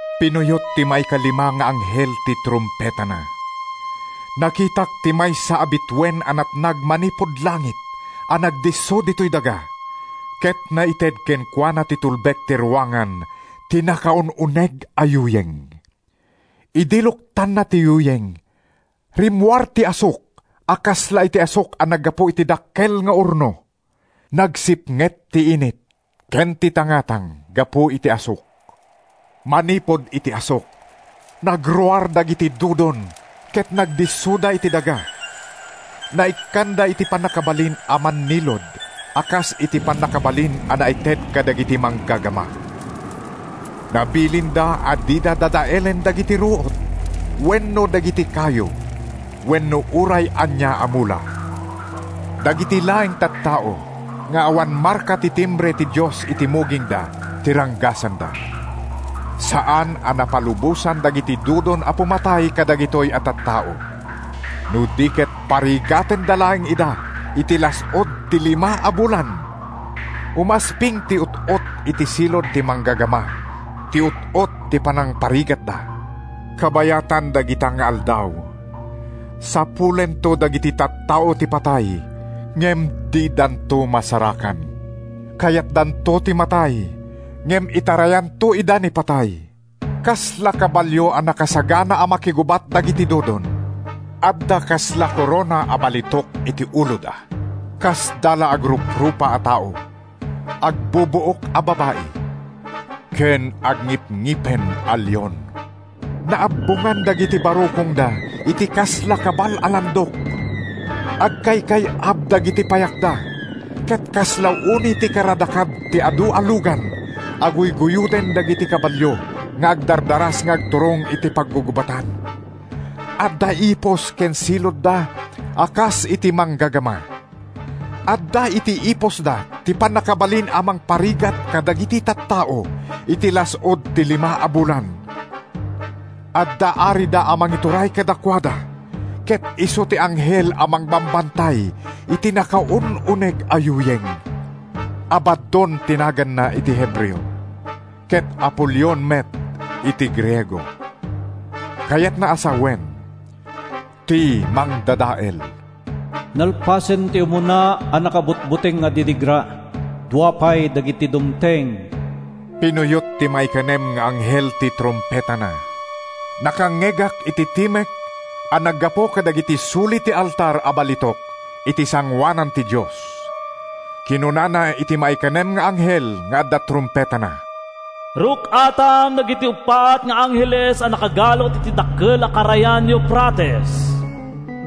Pinuyot ti maikalima nga anghel ti trumpetana. Nakitak ti maysa a bituen a natnag manipud langit a nagdisso ditoy daga, ket naited kenkuana ti tulbek ti ruangan ti nakaun-uneg a yuyeng. Idi luktanna ti yuyeng, rimmuar ti asuk a kasla iti asuk a naggapu iti dakkel nga orno. Nagsipnget ti init ken ti tangatang gapu iti asuk. Manipud iti asuk, nagruar dagiti dudon ket nagdissoda iti daga. Naikkanda iti pannakabalin a mannilud a kas iti pannakabalin a naited kadagiti manggagama. Nabilinda a dida dadaelen dagiti ruot wenno dagiti kayo wenno uray ania a mula. Dagiti laeng tattao nga awan marka ti timbre ti Dios iti mugingda ti ranggasanda. Saan a napalubosan dagiti dudon a pumatay kadagitoy a tattao, no di ket parigatenda laeng ida iti las-ud ti lima a bulan. Umasping ti ut-ot iti silud ti manggagama ti ut-ot ti panangparigatda. Kabayatan dagita nga aldaw, sapulento dagiti tattao ti patay ngem didanto masarakan. Kayatdanto ti matay ngem itarayanto ida ni patay. Kasla kabalio a nakasagana a makigubat dagiti dudon. Adda kasla korona a balitok iti uloda. Kasda la agruprupa a tao, agbubuok a babai, ken agngipngipen a leon. Naabbongan dagiti barukongda iti kasla kabal a landok. Agkaykay-ab dagiti payakda ket kasla uni ti karadakad ti adu a lugan a guyguyoden dagiti kabalio nga agdardaras nga agturong iti paggugubatan. Adda ipus ken siludda a kas iti manggagama. Adda iti ipusda ti pannakabalin a mangparigat kadagiti tattao iti las-ud ti lima a bulan. Adda arida a mangituray kadakuada, ket isu ti anghel a mangbambantay iti nakaun-uneg a yuyeng. Abaddon ti naganna iti Hebreo, ket Apolion met iti Griego (kayatna a sawen, “Ti Mangdadael”). Nalpasen ti umuna a nakabutbuteng a didigra. Dua pay dagiti dumteng. Pinuyot ti maikanem nga anghel ti trumpetana. Nakangngegak iti timek a naggapu kadagiti suli ti altar a balitok iti sangoanan ti Dios. Kinunana iti maikanem nga anghel nga adda trumpetana: “Ruk-atam dagiti uppat nga angheles a nakagalut iti dakkel a karayan Eufrates.”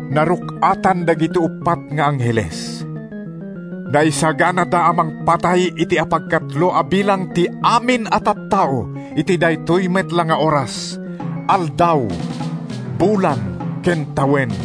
Naruk-atan dagiti uppat nga angheles. Naisaganada a mangpatay iti apagkatlo a bilang ti amin a tattao iti daytoy met la nga oras, aldaw, bulan ken tawen.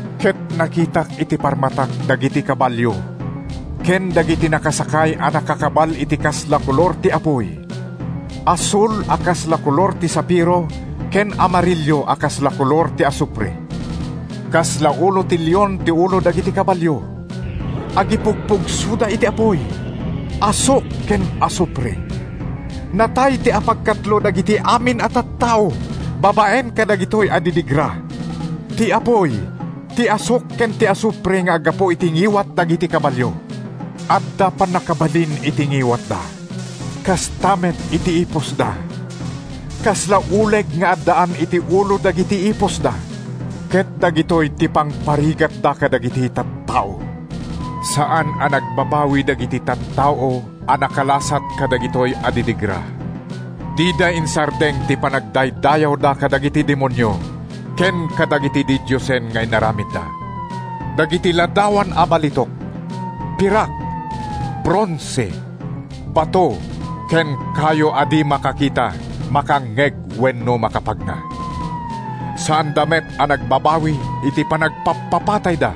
Ket nakitak iti parmatak dagiti kabalio ken dagiti nakasakay a nakakabal iti kasla kolor ti apuy, asul a kasla kolor ti safiro ken amarillo a kasla kolor ti asufre. Kasla ulo ti leon ti ulo dagiti kabalio. Agipugpugsoda iti apuy, asuk ken asufre. Natay ti apagkatlo dagiti amin a tattao babaen kadagitoy a didigra: ti apuy, ti asuk ken ti asufre nga aggapu iti ngiwat dagiti kabalio. Adda pannakabalin iti ngiwatda, kasta met iti ipusda. Kasla uleg nga addaan iti ulo dagiti ipusda, ket dagitoy ti pangparigatda kadagiti tattao. Saan a nagbabawi dagiti tattao a nakalasat kadagitoy a didigra. Dida insardeng ti panagdaydayawda kadagiti demonio ken kadagiti didiosen nga inaramidda—dagiti ladawan a balitok, pirak, bronse, bato ken kayo a di makakita, makangngeg wenno makapagna. Saanda met a nagbabawi iti panagpappapatayda,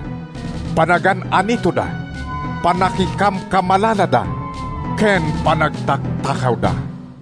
panagan-anitoda, pannakikamkamalalada ken panagtaktakawda.